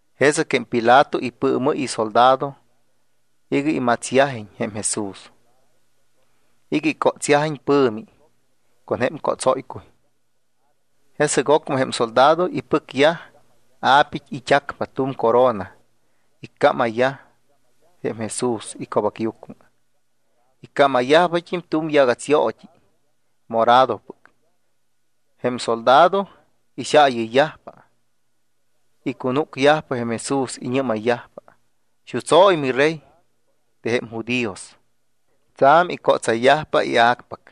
Jesɨc jém Pilato ipɨɨmɨ́y isoldado iga imatsyajiñ jém Jesús y icótsyajiñ pɨ̱mi con jém cótsóycuy. Jesɨc ocmɨ jém soldado ipɨcyaj a̱pit́, it́acpa tu̱m corona, iccámayyaj jém Jesús ico̱bacyucmɨ. Iccámayyajt́im tu̱m yagats yoot́i moradopɨc. Jém soldado ixaayɨyyajpa, icunúcyajpa Jesús, iñɨ́mayyajpa: —Xutsóy, miRey de jém judíos. Tsa̱m icótsayyajpa ia̱cpac.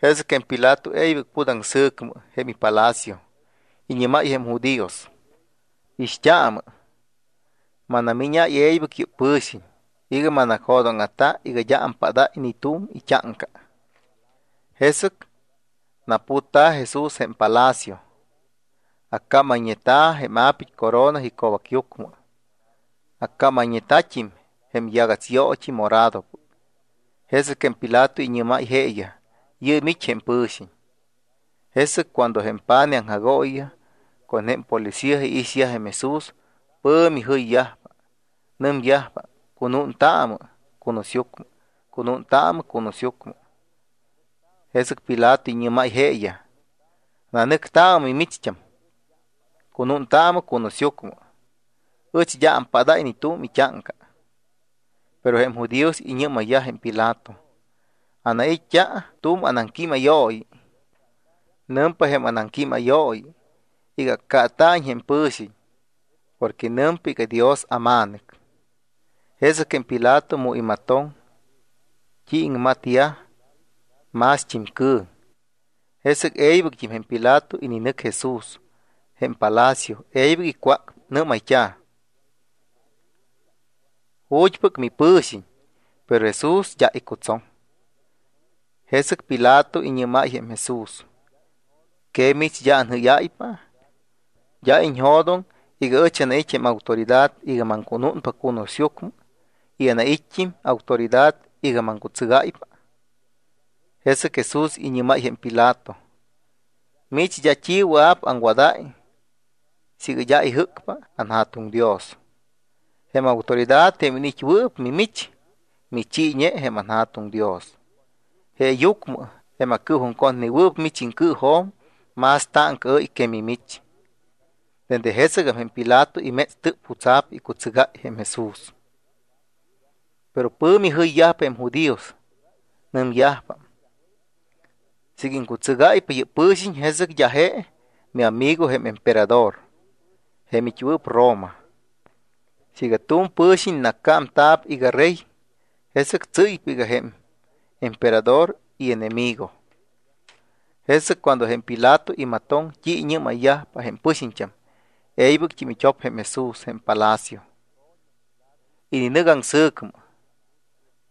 Jesɨc jém Pilato e̱ybɨc put aŋsɨ̱cmɨ jém ipalacio. Iñɨ́máy jém judíos: —Ixt́aamɨ. Manamíñáy e̱ybɨc yɨ́p pɨ̱xiñ iga manacjodóŋa̱ta iga d́a ampádáy ni tu̱m it́áŋca. Jesɨc naputta̱ Jesús jém palacio. Accámayñeta̱ jém a̱pit́ corona ico̱bacyucmɨ. Accámayñeta̱t́im jém yagats yoot́i moradopɨc. Jesɨc jém Pilato iñɨ́máy jeeyaj: —Yɨɨm it́ jém pɨ̱xiñ. Jesɨc cuando jém pa̱nij aŋjagooyiyaj con jém policía iixyaj jém Jesús, pɨ̱mi jɨyyajpa, nɨmyajpa: —¡Cunúntaamɨ cunusyucmɨ! ¡Cunúntaamɨ cunusyucmɨ! Jesɨc Pilato iñɨ́máypa jeeyaj: —Nanɨctaamɨ mimicht́am. Cunúntaamɨ cunusyucmɨ. Ɨch d́a ampadáy ni tu̱m it́áŋca. Pero jém judíos iñɨ́mayyaj jém Pilato: —Anait́t́a tu̱m anaŋquímayooyi. Nɨmpa jém anaŋquímayooyi iga accaata̱iñ jém pɨ̱xiñ porque nɨmpa iga: “Dios aMa̱nɨc.” Jesɨc jém Pilato mu imatoŋ t́i iŋmadayyaj, mást́im cɨ̱ŋ. Jesɨc e̱ybɨct́im jém Pilato ininɨc Jesús jém palacio, e̱ybɨc icwácpa, nɨ́mayt́a̱: —¿Ju̱t́pɨc mipɨ̱xiñ? Pero Jesús d́a icutsoŋ. Jesɨc Pilato iñɨ́máy jém Jesús: —¿Que mimich, d́a anjɨ́yáypa? ¿D́a iñjo̱doŋ iga ɨch anait́ jém autoridad iga maŋcunúnpa cunusyucmɨ y anait́t́im autoridad iga maŋcutsɨgáypa? Jesɨc Jesús iñɨ́máypa jém Pilato: —Mich d́a t́i wɨa̱p aŋwadáy siiga d́a ijɨ́cpa anJa̱tuŋ Dios. Jém autoridad jém iniit́wɨɨp mimich, michiiñe jém anJa̱tuŋ Dios. Jeeyucmɨ jém acɨɨjuŋcotnewɨɨp mich iŋcɨɨjo̱m más táŋcaɨ́y que mimich. Dende jesɨgam jém Pilato imétstɨp jutsa̱p icutsɨgáy jém Jesús. Pero pɨ̱mi jɨyyajpa jém judíos. Nɨmyajpa: —Siiga iŋcutsɨgáypa yɨ́p pɨ̱xiñ, jesɨc d́a je miamigo jém emperador jém it́wɨɨp Roma. Siiga tu̱m pɨ̱xiñ nacámta̱p iga rey, jesɨc tsɨ́ypa iga jém emperador ienemigo. Jesɨc cuando jém Pilato imatoŋ t́i iñɨ́mayyajpa jém pɨxiñt́am, e̱ybɨct́im it́op jém Jesús jém palacio. Ininɨc aŋsɨ̱cmɨ.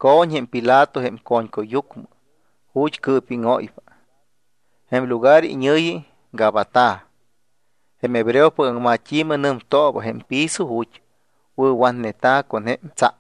Co̱ñ jém Pilato jém co̱ñcuyyucmɨ ju̱t́ cɨɨpíŋóypa. Jém lugar iñɨ̱yi Gabata. Jém hebreopɨc aŋmat́i̱mɨ nɨmtooba jém piso ju̱t́ wɨ̱watneta̱ con jém tsa.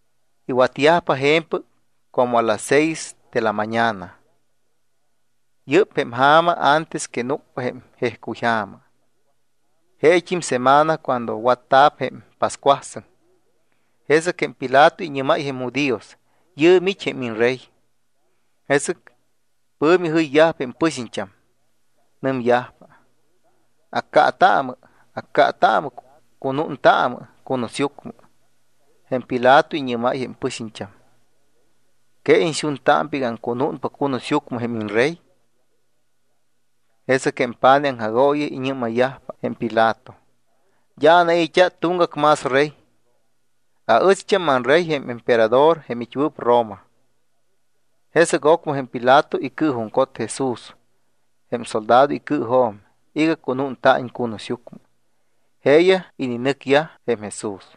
Iwatyajpa je̱mpɨc como las seis de la mañana. Yɨ́p jém ja̱ma antes que núcpa jém jejcuyja̱ma, jeet́im semana cuando watta̱p jém pascuasɨŋ. Jesɨc jém Pilato iñɨ́máy jém judíos: —Yɨɨm it́ jém iñRey. Jesɨc pɨ̱mi jɨyyajpa jém pɨxiñt́am. Nɨmyajpa: —¡Accaataamɨ! ¡Accaataamɨ! ¡Cunúntaamɨ cunusyucmɨ! Jém Pilato iñɨ́máy jém pɨxiñt́am: —¿Que iñxuntámpa iga aŋcunúnpa cunusyucmɨ jém iñRey? Jesɨc jém pa̱nij aŋjagooyiyaj iñɨ́mayyajpa jém Pilato: —D́a anai̱t́a tuŋgac más rey. Aɨcht́am anrey jém emperador jém it́wɨɨp Roma. Jesɨc ocmɨ jém Pilato icɨɨjuŋcot Jesús jém soldado icɨɨjo̱m iga cunúnta̱iñ cunusyucmɨ. Jeeyaj ininɨcyaj jém Jesús.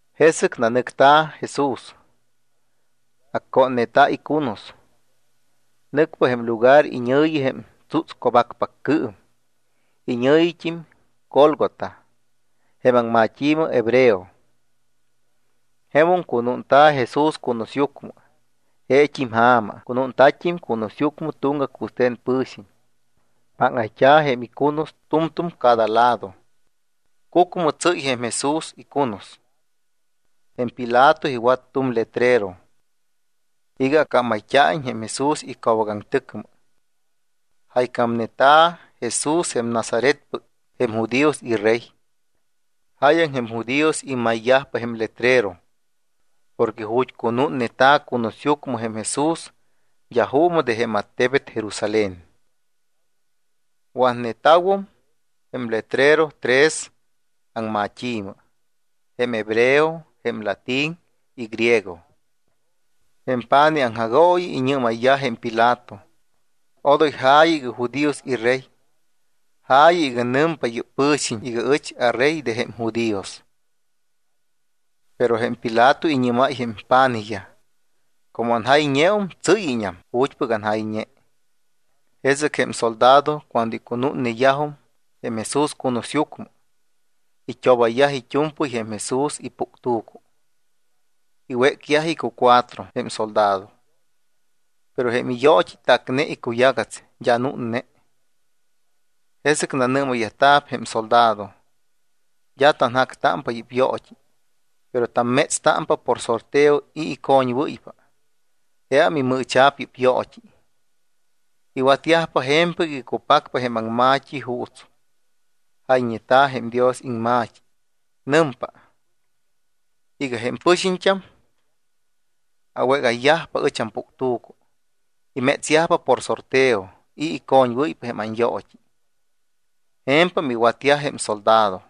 Jesɨc nanɨcta̱ Jesús. Accónneta̱ icunus. Nɨcpa jém lugar iñɨ̱yi jém Tsútsco̱bacpaccɨɨm. Iñɨ̱yit́im Gólgota jém aŋmat́i̱mɨ hebreo. Jemum cunúnta̱ Jesús cunusyucmɨ. Jeet́im ja̱ma cunúnta̱t́im cunusyucmɨ tuŋgac wɨste̱n pɨ̱xiñ. Páŋayt́a̱ jém icunus tu̱mtu̱m cada lado. Cucmɨ tsɨ́y jém Jesús icunus. Jém Pilato iwat tu̱m letrero iga accámayt́a̱iñ jém Jesús ico̱bacaŋtɨcmɨ. Jaycámneta̱: “Jesús jém Nazaretpɨc jém judíos iRey.” Jáyaŋ jém judíos imayyajpa jém letrero porque ju̱t́ cunúnneta̱ cunusyucmɨ jém Jesús, d́a juumɨ de jém attebet Jerusalén. Watneta̱wom jém letrero tres aŋmat́i̱mɨ, jém hebreo, jém latín y griego. Jém pa̱nij aŋjagooyi iñɨ́mayyaj jém Pilato: —Odoy ja̱yɨ iga: “judíos iRey”, ja̱yɨ iga: “Nɨmpa yɨ́p pɨ̱xiñ iga ɨch aRey de jém judíos.” Pero jém Pilato iñɨ́máy jém pa̱nijyaj: —Como anjayñeum, tsɨ́yñam ju̱t́pɨc anjayñe. Jesɨc jém soldado cuando icunúnneyajum jém Jesús cunusyucmɨ, it́obayyaj it́u̱mpɨy jém Jesús ipuctu̱cu. Iwécyaj icucuatro jém soldado, pero jém iyoot́i tácneta̱ icuyagats, d́a núnne. Jesɨc nanɨ́mayyajta̱p jém soldado: —D́a tanjactámpa yɨ́p yoot́i, pero tammétstámpa por sorteo i̱ icoñwɨ́ypa. Jeam imɨɨcha̱p yɨ́p yoot́i. Iwatyajpa je̱mpɨc iga cupacpa jém aŋma̱t́i juuts jayñeta̱ jém Dios iŋma̱t́i. Nɨmpa iga: “Jém pɨxiñt́am awégayyajpa ɨch ampuctu̱cu. Imétsyajpa por sorteo i̱ icoñwɨ́ypa jém anyoot́i.” Je̱mpam iwatyaj jém soldado.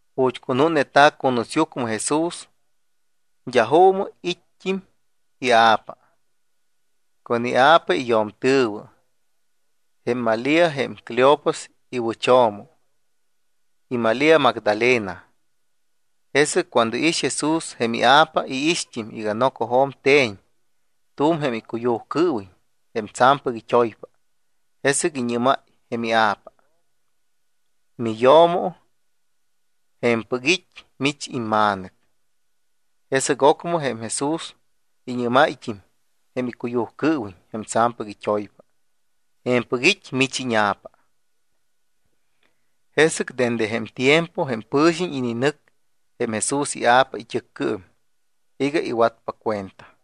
Ju̱t́ cunúnneta̱ cunusyucmɨ Jesús, d́a juumɨ it́t́im ia̱pa, con ia̱pa iyo̱mtɨ̱wɨ, it́ jém Malía jém Cleofas iwɨcho̱mo y Malía Magdalena. Jesɨc cuando iix Jesús jém ia̱pa y iixt́im iga nocojo̱m te̱ñ tu̱m jém icuyujcɨɨwiñ jém tsa̱mpɨc it́oypa, jesɨc iñɨ́máy jém ia̱pa. —Miyo̱mo, je̱mpɨc it́ mich imma̱nɨc. Jesɨc ocmɨ jém Jesús iñɨ́máyt́im jém icuyujcɨɨwiñ jém tsa̱mpɨc it́oypa: —Je̱mpɨc it́ mich íña̱pa. Jesɨc dende jém tiempo jém pɨ̱xiñ ininɨc jém Jesús ia̱pa it́ɨccɨɨm iga iwatpa cuenta.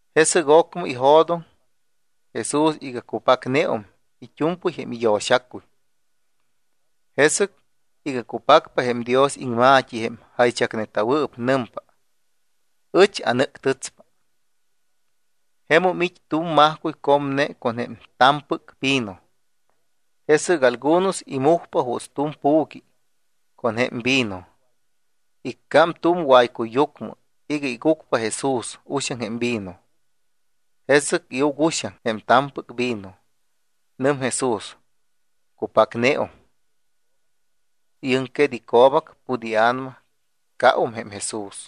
Jesɨc ocmɨ ijo̱doŋ Jesús iga cupacneum it́u̱mpɨy jém iyo̱xacuy. Jesɨc iga cupacpa jém Dios iŋma̱t́i, jém jaychacneta̱wɨɨp, nɨmpa: —Ɨch anɨ́ctɨtspa. Jemum it́ tu̱m majcuy comne con jém ta̱mpɨc vino. Jesɨc algunos imujpa juuts tu̱m pu̱qui con jém vino, iccám tu̱m waycuyyucmɨ iga igucpa Jesús uxaŋ jém vino. Jesɨc iuc uxaŋ jém ta̱mpɨc vino, nɨm Jesús: —Cupacneum. Iɨŋquet ico̱bac, put ia̱nama, caum jém Jesús.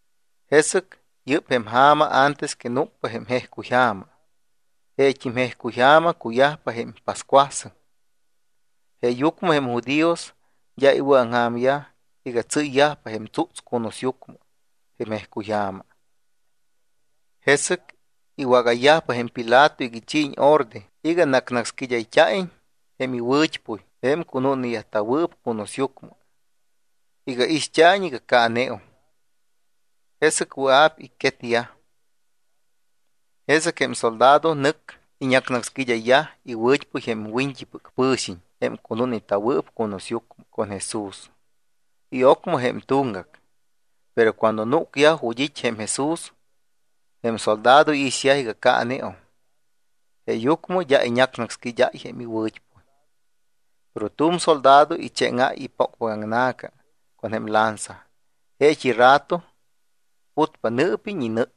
Jesɨc yɨ́p jém ja̱ma antes que núcpa jém jejcuyja̱ma. Jeet́im jejcuy ja̱ma cuyajpa jém pascuasɨŋ, jeeyucmɨ jém judíos d́a iwɨ̱aŋja̱myaj iga tsɨ́yyajpa jém tsúts cunusyucmɨ jém jejcuyja̱ma. Jesɨc iwágayyajpa jém Pilato iga ichiiñ orde iga nácsnácsquid́ayt́a̱iñ jém iwɨ̱t́puy jém cunúnneta̱wɨɨp cunusyucmɨ iga ixt́a̱iñ iga caaneum. Jesɨc wɨa̱p icquetyaj. Jesɨc jém soldado nɨc iñácsnácsquíd́ayyaj iwɨ̱t́puy jém wiñt́ipɨc pɨ̱xiñ jém cunúnneta̱wɨɨp cunusyucmɨ con Jesús y ocmɨ jém tuŋgac. Pero cuando núcyaj ju̱t́ it́ jém Jesús, jém soldado iixyaj iga caaneum. Jeeyucmɨ d́a iñácsnácsquíd́áy jém iwɨ̱t́puy. Pero tu̱m soldado ichéŋáy ipócpacaŋna̱ca con lanza, jeet́i rato putpa nɨɨpiñ y nɨ.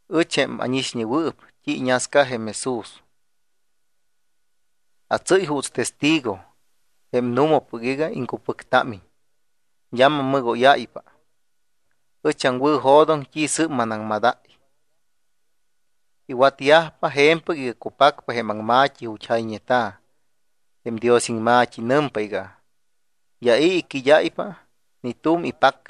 Ɨch, jém ánixñewɨɨp t́i iñasca jém Jesús, atsɨ́y juuts testigo jém nu̱mapɨc iga iŋcupɨctámiñ. D́a mammɨgóyáypa. Ɨch aŋwɨ̱jo̱doŋ t́i sɨ́p manaŋmadáy. Iwatyajpa je̱mpɨc iga cupacpa jém aŋma̱t́i ju̱t́ jayñeta̱ jém Dios iŋma̱t́i. Nɨmpa iga: “D́a i̱ iquid́áypa ni tu̱m ipac.”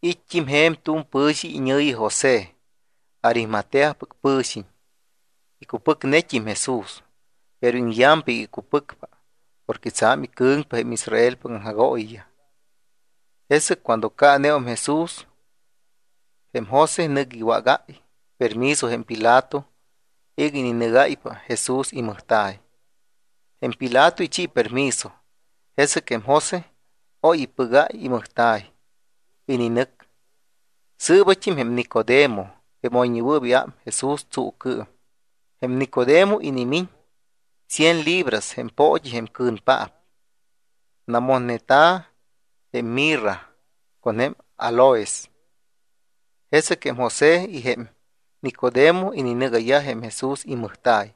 It́t́im je̱m tu̱m pɨ̱xiñ iñɨ̱yi José, Arimateapɨc pɨ̱xiñ. Icupɨcnet́im Jesús, pero iŋyampa iga icupɨcpa porque tsa̱m icɨ̱ŋpa jém Israelpɨc aŋjagooyiyaj. Jesɨc cuando caaneum Jesús, jém José nɨc iwágáy permiso jém Pilato iga ininɨgáypa Jesús imɨjta̱y. Jém Pilato ichi permiso. Jesɨc jém José oy ipɨgáy imɨjta̱y, ininɨc. Sɨɨbat́im jém Nicodemo, jém oyñewɨɨp iám Jesús tsuucɨɨm. Jém Nicodemo inimiñ cien libras jém poot́i jém cɨ̱npaap, namotneta̱ jém mirra con jém áloes. Jesɨc jém José y jém Nicodemo ininɨgáy jém Jesús imɨjta̱y.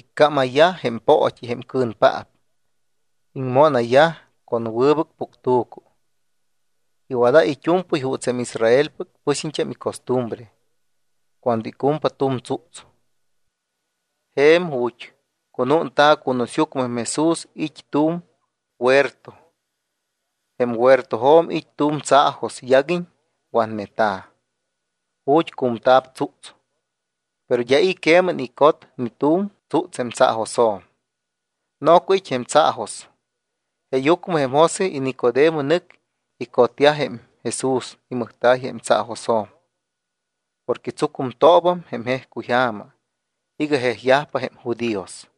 Iccámayyaj jém poot́i jém cɨ̱npaap, iŋmónayyaj con wɨbɨc puctu̱cu. Iwadáy it́u̱mpɨy juuts jém Israelpɨc pɨxiñt́am icostumbre cuando icumpa tu̱m tsúts. Je̱m ju̱t́ cunúnta̱ cunusyucmɨ jém Jesús it́ tu̱m huerto. Jém huertojo̱m it́ tu̱m tsaajos yaguiñ watneta̱, ju̱t́ cu̱mta̱p tsúts. Pero d́a i̱ queman icot ni tu̱m tsúts jém tsaajosjo̱m. Noco it́ jém tsaajos. Jeeyucmɨ jém José y Nicodemo nɨc icodayyaj jém Jesús imɨjta̱y jém tsaajosjo̱m porque tsucumtoobam jém jejcuy ja̱ma iga jejyajpa jém judíos.